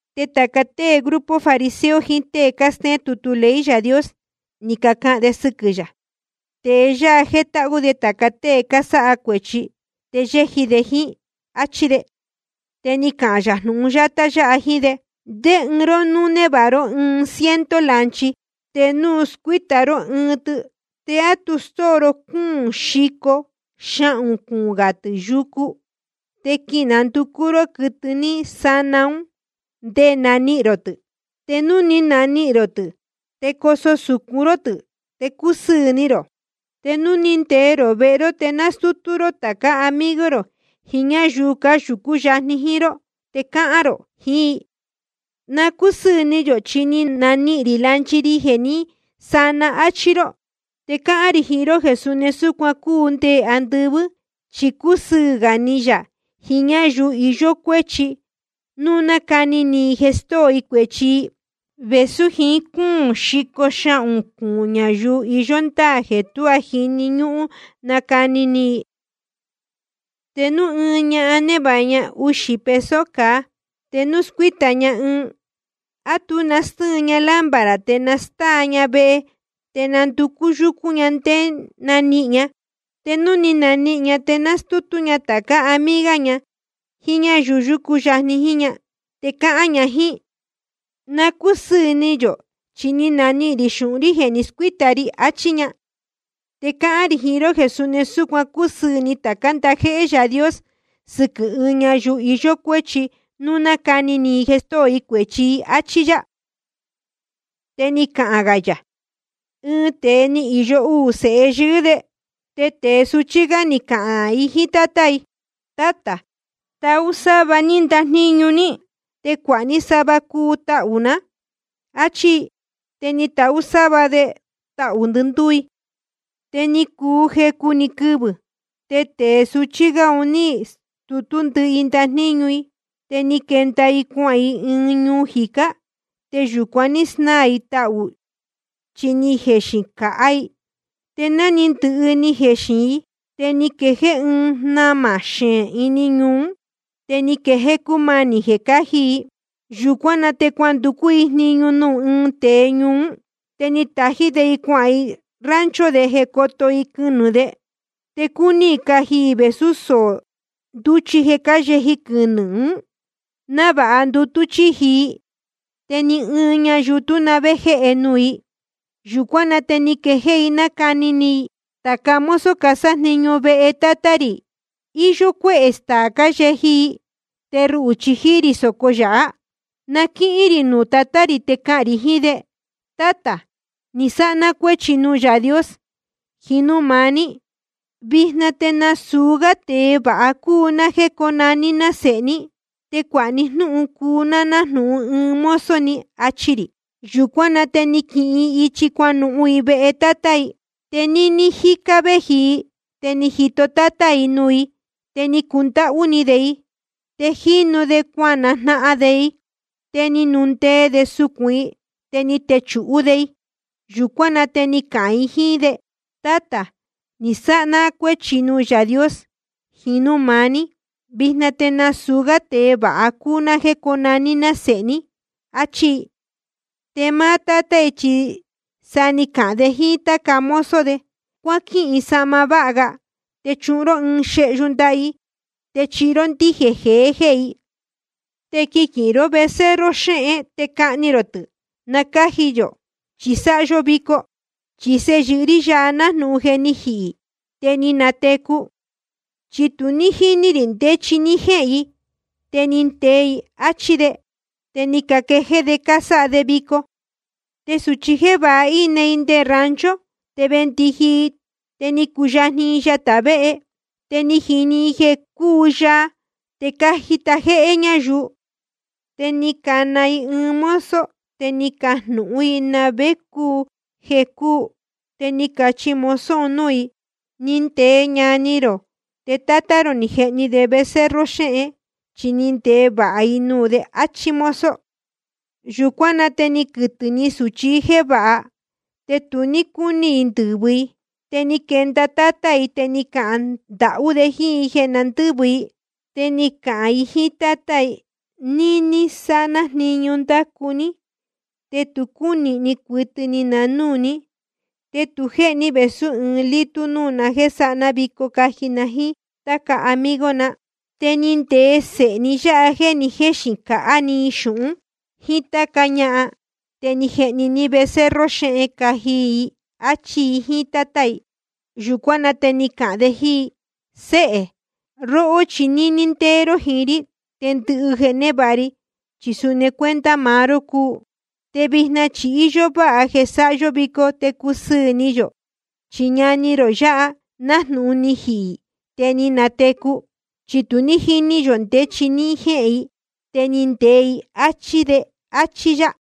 Te tāca tée grupo fariseo jiín tée cástéén tutu ley Yaā Dios, ni cacahān de sɨquɨ̄ yā: Tēe yáha jétáhú de tāca tée cásáha cuēchi te yéji de jíín, áchí de. Te ni cahān yā jnūhun yátá yáha jíín de: ¿Ndé ɨɨn ró núu névāha ró ɨɨn ciento lanchi, te núu scuíta ró ɨɨn tɨ, te á tu stóo ró cúūn xico xahūn cuūn gā tɨ̄ yucu, te quinanducú ró quɨtɨ ní sana ún ndé nanihīn rō tɨ̄? Te núu ni nanihīn rō tɨ̄, te coso sūcun ró tɨ̄, te cusɨɨ̄ ni rō. Te núu ni ndee rō vehe ró, te nastútú ró tācá amigo rō jiín ñáyuu yúcu yajni jíín ró, te cahān rō jiín i: Na cúsɨɨ̄ ni yō, chi ni nanihīn rī lanchi ri jeē ní sana. Achi rō. Te cáhán rī jiín ró jeē suni súcuan cúu nde andɨvɨ́. Chi cúsɨɨ̄ gā ni yā jiín ɨɨn ñayuu iyó cuéchi núu nacani ni i jeē stóo i cuēchi i, vēsú jiín cúūn xico xahūn cuūn ñayuu iyó ndáā jeē tuá jíni ñúhún nacani ni i. ’Te núu ɨɨn ñahan névāha ña uxī peso cāa, te núu scuíta ña ɨɨn, ¿á tu nastɨ́ɨn ña lámpara te nastáa ña vehe, te nanducú yúcún ña nde nanihīn ña? Te núu ni nanihīn ña, te nastútú ña tācá amiga ña jíín ñáyuu yúcu yajni jíín ña, te cahān ña jíín i: Na cúsɨɨ̄ ni yō, chi ni nanihīn rī xūhun jéē ni scuíta ri. Achí ña. Te cáhán rī jiín ró jeē suni súcuan cúsɨɨ̄ ni tācá ndajéhé Yaā Dios sɨquɨ̄ ɨɨn ñayuu iyó cuéchi núu nacani ni i jeē stóo i cuēchi i. Achí yá. Te ni cahān gā yā: Ɨɨn tēe ni īyo uū sēhe yɨɨ́ de. Te tēe suchí gá ni cahān i jíín tátá i: Tátā, tahú sáva ní ndajníñu ní, te cuāha ní sava cuu tahū ná, áchí i. Te ni tahú sáva de tahū ndɨndúú i. Te ni cuu jecu‑ni quɨvɨ̄, te tēe suchí gá un ní stutú ndɨhɨ i ndajníñu i. Te ni quenda i cuahān i ɨɨn ñuu jicá. Te yūcuan ní snáā i tahū i, chi ni jexīn cāhá i. Te ná ni ndɨhɨ ni jexīn i, te ni quee ɨɨn jnamā xeén ini ñuu ún, te ni quejéé cúmanī jeē cáji i. Yūcuán na te cuanducú jníñu i nuū ɨɨn tēe ñuu ún. Te ni tají de i cuahān i rancho de jeē cóto i quɨnɨ̄ de. Te cúní i caji i vēsú soō ndúchi jeē cáyeji quɨnɨ̄ ún, návāha ndutú chíji i. Te ni ɨɨn ñayuu tú na vé jéhe nuū i. Yūcuán na te ni quejéé i nácani ni i: Tāca mozo casájniñu vehe tátá rī, íyó cuéhē staā cáyeji i. Te ruhū chi jíí rī sōco yāhá. Na quínuhun rī nuū tatá rī, te cahān rī jiín de: Tátā, ni sáha ná cuéchi nuū Yaā Dios jiín núū maá ní. Vijna te nasūu gá tēe vāha cúu ná jéē cónaní ná sēhe ní. Te cuāha ní jnúhun cuu ná nájnūhun ɨɨn mozo ni, achi rī. Yūcuán na te ni naquihin i ichi cuanuhun i vehe tátá i. ’Te níní jícá gá vēji i, te ni jito tátá i nuū i, te ni cundáhú ni de i. Te jínu de cuajnahan de i, te ni nundee de sucūn i, te ni techūhú de i. Yūcuán na te ni cahān i jíín de: Tátā, ni sáha ná cuéchi nuū Yaā Dios jiín núū maá ní. Vijna te nasūu gá tēe vāha cúu ná jéē cónaní ná sēhe ní. Achí i. Te máá tátá i chi sa ni cahān de jíín táca mozo de: Cuáquihin sahma váha ga te chuhun ró i. Te chuhun ró ɨɨn xehyu ndaha i, te chihi ró ndíjēn jehē i. Te quiquīhin ró becerro xéhen, te cahni rō tɨ̄ na cáji yō, chi sáha yó vico. Chi sēhe yɨɨ́ rí yáha, nájnūhun je ni jihī i, te ni natecu i. Chi tu ní jíní rī ndé chi ní jéhēn i, te ni ndee i, áchí de. Te ni caquejéé de cásáha de vico. ’Te sūchi jévāha, íne i nde rancho, te vēndiji i, te ni cuyajni i yatā véhe. Te ni jini i jeē cúu yaa te cájita jéhé ñáyuu. Te ni cana i ɨɨn mozo, te ni cajnūhún i na vé cúu jeē cúu. Te ni cachi mozo un núū i: Ni ndee ñani rō, te tátá rō ni jehni de becerro xéhen, chi ni ndee vāha i nuū de, áchí mozo. Yūcuán na te ni quɨtɨ̄ ni sūchi jévāha, te tu ní cúní i ndɨ̄vɨ i. Te ni quenda tátá i, te ni cahān ndahú de jíín i jeē na ndɨ́vɨ i. Te ni cahān i jíín tátá i: Níní sáha ná jniñu ndácu ní, te tu cúnīhni cuɨtɨ ni na núū ní. Te tu jéhe ní vēsú ɨɨn lítú núū ná, jeē sáha ná vico caji na jíín táca amigo na. Te ni ndee sēhe ní yáha jeē ni jéxīn cāhá i xūhun ní jíín táca ñahan. Te ni jehni ní becerro xéhen caji i, áchí i jíín tátá i. Yūcuán na te ni cahān de jíín i: Séhē, róhó chi níní ndéé ró jiín rí, te ndɨhɨ jeē névāha ri chi suni cuenta maá ró cúu. Te vijna chi íyó váha jeē sáha yó vico te cusɨɨ̄ ni yō. Chi ñani rō yāhá, nájnūhun ni jihī i, te ni natecu i. Chi tu ní jíní yō ndé chi ní jéhēn i, te ni ndee i, áchí de. Achí yá.